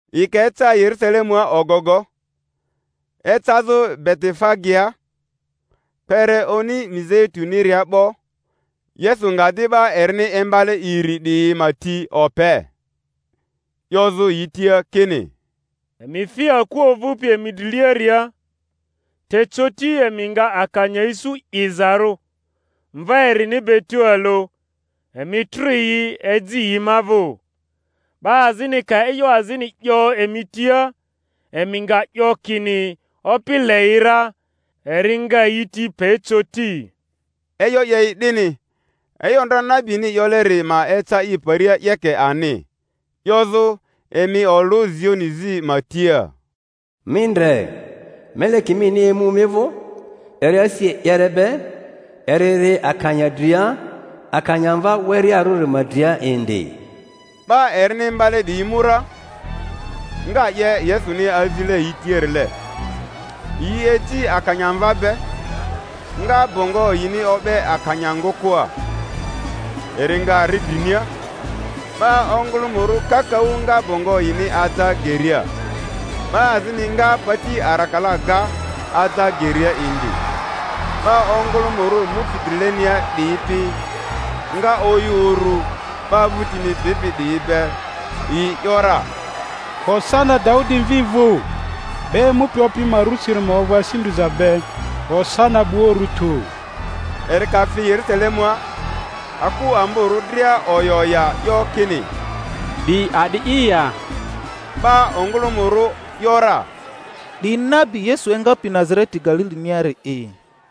Yi ka eca Yerusalemua ogogo, ecazᴜ Betifagea, kpere Oni Mizeituniria 'bo, Yesu nga di 'ba erini imbale iri 'diyi ma ti ope, 'yozᴜ yi tia kini, Emi fi aku ovᴜpi emi driliaria, te coti emi nga akanya isu 'izarᴜ, mva erini be tualᴜ; emi trᴜ yi, eji yi ma vᴜ. 'Ba azini ka e'yo azini 'yo emi tia, emi nga 'yo kini, Opi le yi ra; eri nga yi ti pe coti. E'yo 'ye i 'dini, e'yo ndra nabini 'yoleri ma eca i paria 'yeke ani, 'yozᴜ, Emi olᴜ Zioni zi ma tia, Mi ndre, meleki mini emu mi vᴜ, eri asi e'yere be, eri ri akanya dria, akanyamva werearᴜri ma dria indi. 'Ba erini imbale 'diyi mu ra, nga 'ye Yesuni azile yi tiarile; yi eji akanya mva be, nga bongo yini o'be akanya ngᴜkᴜa; eri nga ri drinia. 'Ba ongᴜlᴜmᴜrᴜ kakaᴜ nga bongo yini aja geria; 'ba azini nga pati arakala ga, aja geria indi. 'Ba ongᴜlᴜmᴜrᴜ mupi drilenia 'diyi pi nga oyᴜ uru, 'ba vᴜtini bipi 'diyi be, yi ‘yora, Hosana Daudi mvi vᴜ! 'Ba emupi Opi ma rusiri ma ovᴜ asi ndriza be! Hosana 'bua urᴜ tᴜ! Eri ka fi Yerᴜsalemua, aku amborᴜ dria oya oya, 'yo kini, 'Di a'di'i ya? 'Ba ongᴜlᴜmᴜrᴜ ‘yora, 'Di nabi Yesu engapi Nazareti Galiliniari'i.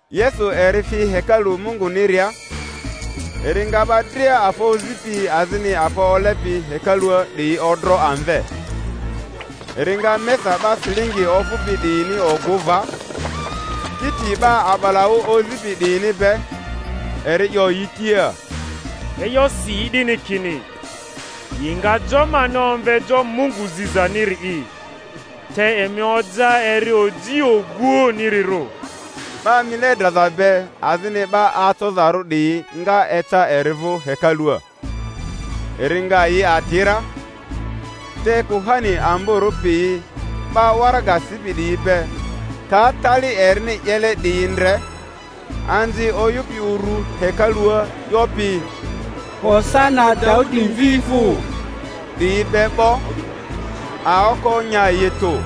Yesu eri fi hekalu Munguniria, eri nga 'ba dria afa ozipi azini afa olepi hekalua 'diyi odro amve, eri nga mesa 'ba silingi ofᴜpi 'diyini ogᴜ va, kiti 'ba a'balaᴜ ozipi 'diyini be. Eri 'yo yi tia, E'yo si i 'dini kini, Yi nga jo mani omve jo Mungu zizaniri'i; te emi oja eri oji oguoᴜnirirᴜ. 'Ba mile draza be azini 'ba acozarᴜ 'diyi nga eca eri vᴜ hekalua, eri nga yi ati ra. Te kuhani amborᴜ piyi 'ba waraga sipi 'diyi be ka tali erini 'yele 'diyi ndre, anzi oyᴜpi uru hekalua 'yopi, Hosana Daudi mvi vᴜ! diyi be 'bo, aoko nya yi tᴜ;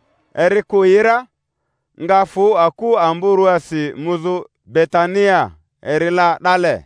Eri kᴜ yi ra, nga fᴜ aku amborᴜasi muzᴜ Betania, eri la 'dale.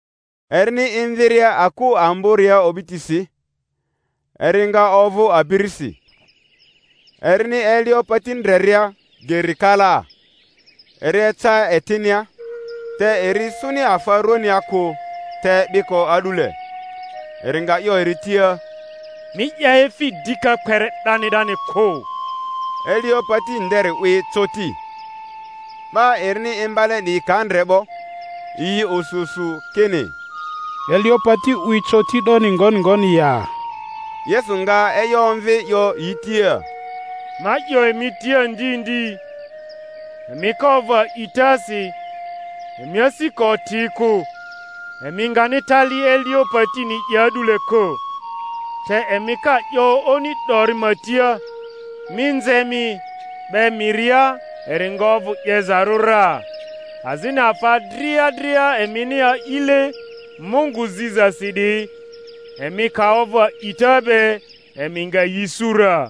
Erini emviria aku amboria o'bitisi, eri nga ovᴜ abirisi. Erini elio pati ndreria ger kalaa, eri eca etinia, te eri isuni afa rᴜania kᴜ te biko a'dule. Eri nga 'yo eri tia, Mi 'ya efi dika kpere 'dani 'dani kᴜ! Elio pati nderi 'wi coti. 'Ba erini imbale 'diyi ka ndre 'bo, yi osu osu, kini, Elio pati 'wi coti 'doni ngoni ngoni ya? Yesu nga e'yo omvi, 'yo yi tia, Ma 'yo emi tia ndi ndi, emi ka ovᴜ a'itasi, emi asi ka oti kᴜ, emi ngani tali elio patini 'ye a'dule kᴜ, te emi ka 'yo oni dori ma tia, Mi nze mi, 'be miria, eri nga ovᴜ 'yezarᴜ ra. Azini afa dria dria emini a'ile Mungu zizasi 'diyi, emi ka ovᴜ a'ita be, emi nga yi isu ra.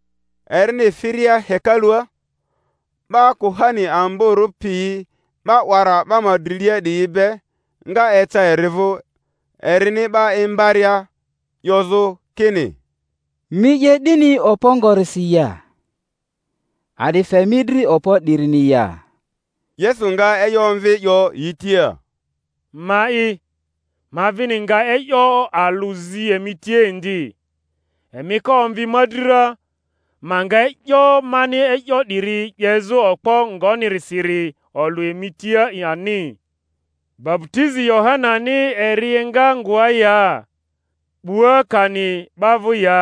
Erini firia hekalua, 'ba kuhani amborᴜ piyi 'ba 'wara 'ba ma drilia 'diyi be nga eca eri vᴜ erini 'ba imbaria, 'yozᴜ kini, Mi 'ye 'dini okpo ngonirisi ya? A'di fe mi dri okpo 'dirini ya? Yesu nga e'yo omvi, 'yo yi tia, Ma'i, ma vini nga e'yo alᴜ zi emi tia indi; emi ka omvi ma dri ra, ma nga e'yo mani e'yo 'diyi 'yezᴜ okpo ngonirisiri olᴜ emi tia ani. Baputizi Yohanani eri enga ngoa ya? 'Bua kani 'ba vᴜ ya?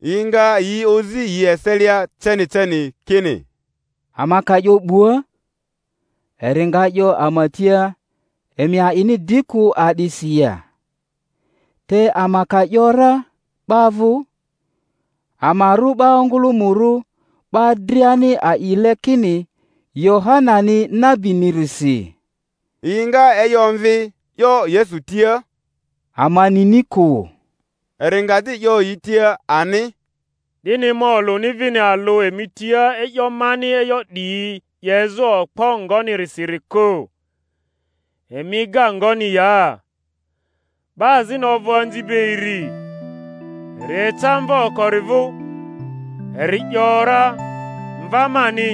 Yi nga yi ozi yi eselia ceni ceni kini, Ama ka 'yo 'Bua, eri nga 'yo ama tia, Emi a'ini di kᴜ a'disi ya? Te ama ka ‘yora, 'Ba vᴜ, ama rᴜ 'ba ongᴜlᴜmᴜrᴜ; 'ba driani a'ile kini Yohanani nabinirisi. Yi nga e'yo omvi, 'yo Yesu tia, Ama nini kᴜ. Eri nga di 'yo yi tia ani, Dini ma olᴜni vini alᴜ emi tia e'yo mani e'yo 'diyi 'yezᴜ okpo ngonirisiri kᴜ. Emi ega ngoni ya? 'Ba azini ovᴜ anzi be iri; eri eca mva okori vᴜ, eri ‘yora, Mva mani,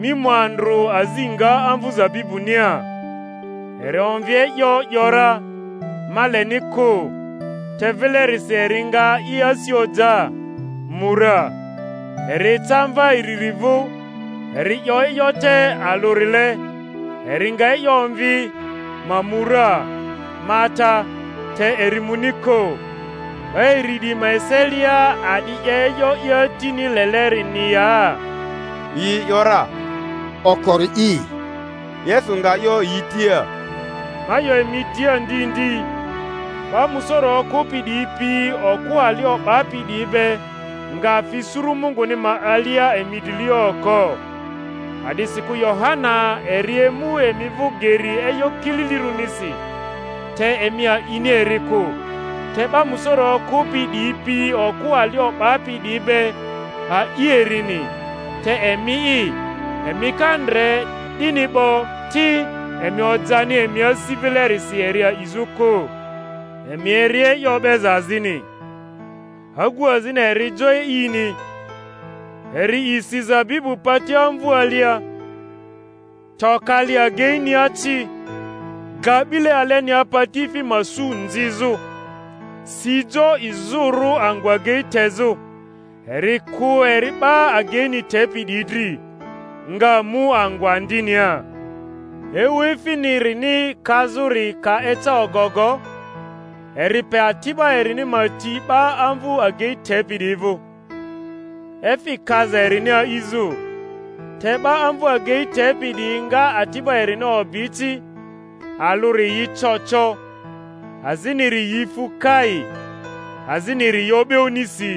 mi mu andrᴜ azi nga amvu zabibunia. Eri omvi e'yo, ‘yora, Ma leni kᴜ; te vilerisi eri nga i asi oja, mu ra. Eri eca mva iriri vᴜ, eri 'yo e'yo te alᴜrile; eri nga e'yo omvi, Ma mu ra, ma ata; te eri muni kᴜ. 'Ba iri 'diyi ma eselia, a'di 'ye e'yo i atini lelerini ya? Yi ‘yora, Okori'i. Yesu nga 'yo yi tia, Ma 'yo emi tia ndi ndi, 'ba musoro okᴜpi 'diyi pi okᴜ ali o'bapi 'diyi be nga fi suru Munguni ma alia emi drilia oko. A'disikᴜ Yohana eri emu emi vᴜ geri e'yo kililirᴜnisi, te emi a'ini eri kᴜ, te 'ba musoro okᴜpi 'diyi pi okᴜ ali o'bapi 'diyi be a'i erini; te emi'i, emi ka ndre 'dini 'bo ti, emi ojani emi asi vilerisi eri a'izᴜ kᴜ. Emi eri e'yo o'beza azini. Agu azini eri jo e'ini, eri isi zabibu pati amvu alia, to kali ageinia ci, ga 'bile alenia patiefi ma su nzizᴜ, si jo izᴜrᴜ angᴜ agei tezᴜ, eri kᴜ eri 'ba ageini tepi 'diyi dri, nga mu angᴜ andinia. Ewu efinirini kazᴜri ka eca ogogo, eri pe ati'ba erini ma ti 'ba amvᴜ agei tepi 'diyi vᴜ, efi kaza erini a'izᴜ; te 'ba amvu agei tepi 'diyi nga ati'ba erini obi ci, alᴜri yi co co, aziniri yi fu kai, aziniri yi o'be onisi.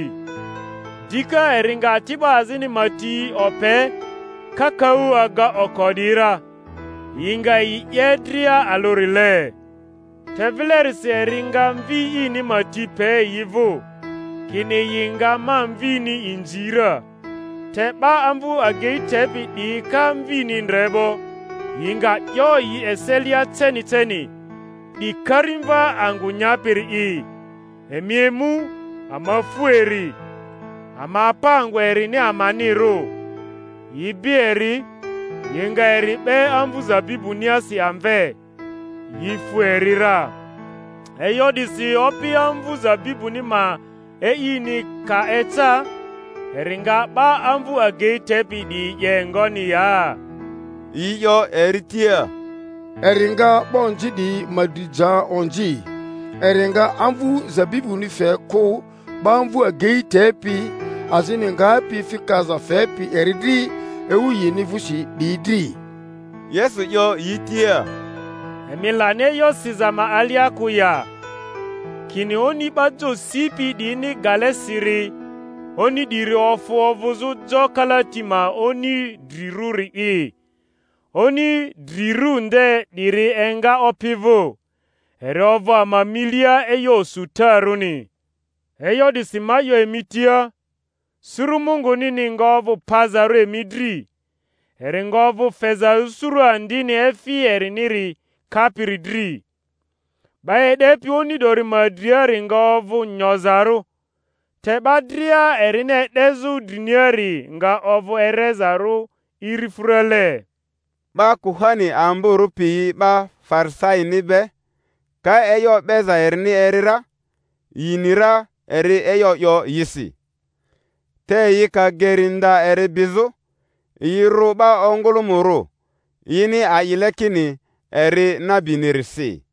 Dika eri nga ati'ba azini ma ti ope, kakaᴜ aga oko 'diyi ra; yi nga yi 'ye dria alᴜrile. Te vilerisi eri nga mvi ini ma ti pe yi vᴜ, kini, Yi nga ma mvini inzi ra. Te 'ba amvu agei tepi 'diyi ka mvini ndre 'bo, yi nga 'yo yi eselia ceni ceni, 'Di karimva angᴜ nyapiri'i; emi emu, ama fu eri, ama pa angᴜ erini amanirᴜ. Yi bi eri, yi nga eri 'be amvᴜ zabibuniasi amve, yi fu eri ra. E'yo 'disi opi amvu zabibuni ma e'ini ka eca, eri nga 'ba amvu agei tepi 'diyi 'ye ngoni ya? Yi 'yo eri tia, Eri nga 'ba onzi 'diyi ma dri ja onzi, eri nga amvu zabibuni fe kᴜ 'ba amvᴜ agei tepi azini, ngapi efi kaza fepi eri dri ewu yini vᴜsi 'diyi dri. Yesu 'yo yi tia, Emi lani e'yo siza ma alia kᴜ ya, kini: Oni 'ba jo sipi 'diyini gale siri, oni 'diri ofᴜ ovᴜzᴜ jo kalati ma oni drirᴜri'i, oni drirᴜ nde 'diri enga Opi vᴜ, eri ovᴜ ama milia e'yo osutarᴜni. E'yo 'disi ma 'yo emi tia, suru Mungunini nga ovᴜ pazarᴜ emi dri, eri nga ovᴜ fezarᴜ suru andini efi eriniri kapiri dri. 'Ba e'depi oni 'dori ma driari nga ovᴜ nyozarᴜ, te 'ba dria erini e'dezᴜ driniari nga ovᴜ erezarᴜ irifᴜrale. 'Ba kuhani amborᴜ piyi 'ba Farisaini be ka e'yo o'beza erini eri ra, yi ni ra eri e'yo 'yo yisi. Te yi ka geri nda eri bizᴜ, yi rᴜ 'ba ongᴜlᴜmᴜrᴜ, yini a'ile kini eri nabinirisi.